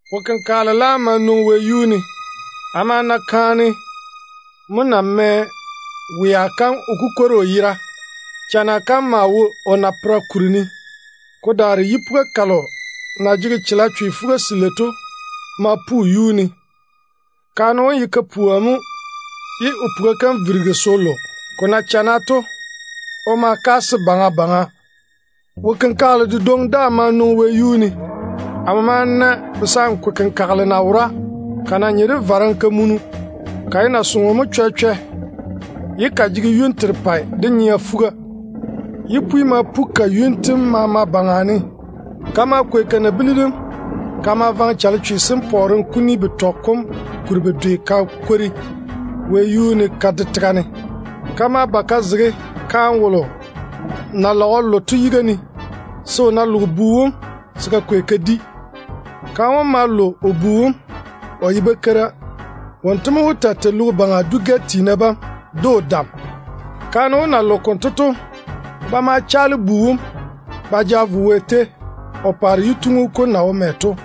Wo-kenkagele laam ma nwoŋi wɛyuu ne. Amo ma na kaane na mɛ wea kam o kukwori o yera. Chana kam maa wo o napera kuri ne. Ko daare yipuga kalo na jege chalechwe fuga-selei to ma pu o yuu ne. Kaane wom ye kapua mo ye o puga kam virigi se o lo. Ko na chana to, o ma kaase baŋa baŋa. Wo-kenkagele dedwoŋi daa ma nwoŋi wɛyuu ne. Amo ma na kayanchɔrɔ kayanchɔrɔ = dragon na wora, ko na nye de vare-kamunu. Ko ye nasoŋo mo chwɛ-chwɛ ye ko jege yuni terepɛ, de nyea fuga. Paare yipwi ma pu ko yuni tem maama baŋa ne. Ko ma kwei ko nabili dem ko ma vaŋe chalechwe sem pɔɔrem kuni betɔ wone kuri bedwe ko kwori wɛyuu ne ko de tega ne. Ko ma ba ko zege kaane wolo na lage o lo to yiga ne, se o ná loge bu wom, se ko kwei ko di. Kaane wom ma lo o bu wom, o ye bakeira mo. Wonto mo wó taa tei logo baŋa dwi tiina maama de o dam. Kaane wom na loge konto to, ba ma chaale bu wom ba ja vo Wɛ tei, o paare yituŋu kom na wo mɛ to.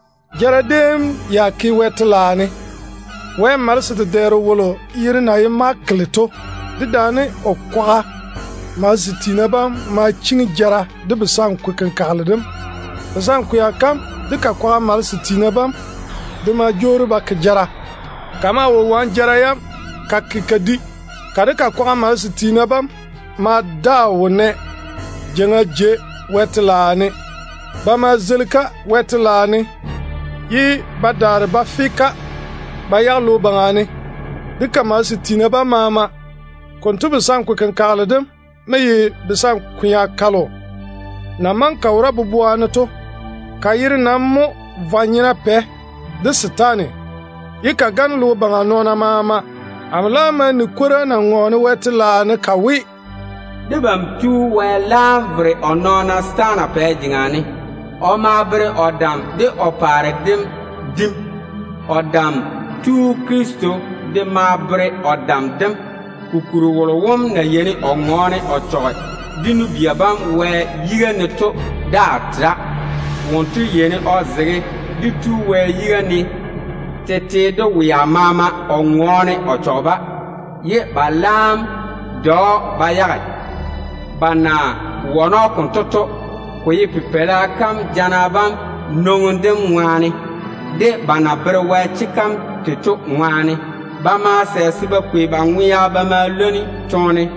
Jara déem ya ke Wɛ telaao ne. Wɛ malese dedɛɛro wolo yere na ye Mikayeli to dedaane o kwaga malese sem ma chiŋi jara de kayanchɔrɔ kom. Kayanchɔrɔ kom de ko kwaga malese sem de ma jwoori se kwaare jara yam. Ko maa wo wane jara yam ko ke ko di. Ko de ko kwaga malese sem ma daa wo nɛ jeiŋa jei Wɛ telaao ne. Ba ma zeili-ko Wɛ telaao ne ba dole ba yage logo baŋa ne, de ko kwaga malese sem maama. Kayanchɔrɔ kom konto mo ye basankwea kalo na maŋe ka wora faŋa faŋa to. Ka yere nam mo ye ‘Vwa-nyena pɛ’, de ‘Setaane’, ye ka gane logo baŋa nɔɔna maama. Amo laam ma ni kwora na ŋɔɔne Wɛ telaao ne ka we, “Leile konto debam Tu Wɛ tu o vere o nɔɔna setaana pɛ jeŋa ne. O ma pa o dam de o paare dem bere jaja. O Dam Tu Krista de tu se o taa tei nɔɔna de dam. Kokuri wolo wom na yeini o ŋɔɔne o chɔge dé nu-bia bam Wɛ yiga ne to daa tera. Wonto mo yeini o zege dé Tu Wɛ yiga ne tete de wea maama o ŋɔɔne o chɔge-ba. Ba laam nam de‑o ba yage. Ba na wane‑o konto to, ko ye Pipeila kam toone jana bam de ba na bere Wɛ chega kam tei to ŋwaane mo. Ba ma sɛ se ba kwei ba ŋwea ba ma leini toone.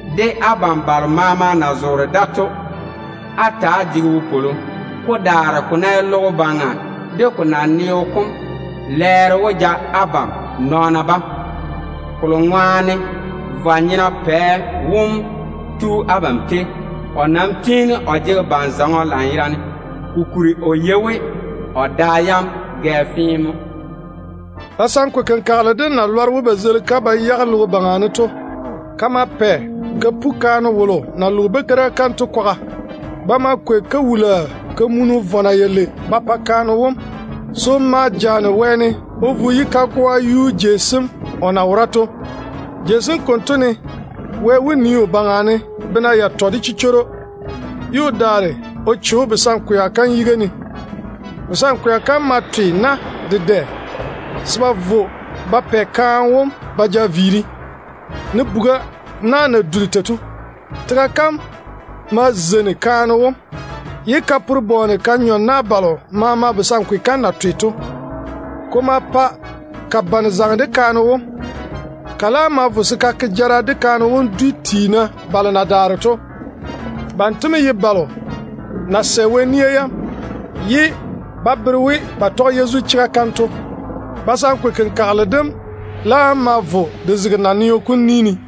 Abam balo maama na zoore wɛ telaao jei sem ne to, á ta‑á chaka de wopwolo. Ko daare ko ná ye logo baŋa de ko naneo kom, lɛɛro wó ba abam nɔɔna bam baŋa, vwa-nyena pɛ wom na tu abam tei to ŋwaane. O nam tiini o jege ban-zɔŋɔ lanyerane, kokuri o yei we o da yam gɛ fee mo.” Kayanchɔrɔ kom na lɔre we ba zeili-ko ba yage logo baŋa ne to, ko ma pɛ kaane wolo na loge bakeira kam to kwaga ko pu. Ba ma kwei kawul-zɔŋɔ vɔna yalei ba pa kaane wom se o ma jaane wɛɛne o vo o yi kagoa kam yuu jei sem o na maŋe se o taa wora to. Dáane mo Wɛ wó nii o baŋa ne bena yatɔ de chichworo, ye o daare o che‑o kayanchɔrɔ kom yiga ne. Kayanchɔrɔ kom ma twe na dedɛ se ba vo ba pɛ kaane wom ba ja viiri, ne bu-tola na na duri tei to. Tega kam ma zeini kaane wom, ye ka pore bɔɔne ka nyɔ na balo maama kayanchɔrɔ kom na twe to. Konto ŋwaane mo kayanchɔrɔ kom bane tiini de zaŋe de kaane wom. Ko laam ma vo se ko ke jara de kaane wom dwi tiina balo na daare to. Banto mo ye balo na sɛ Wɛ nia yam, ye ba bere we ba tɔge Yezu chega kam to. Kayanchɔrɔ kom laam ma vo ko zege naneo kom ni ne.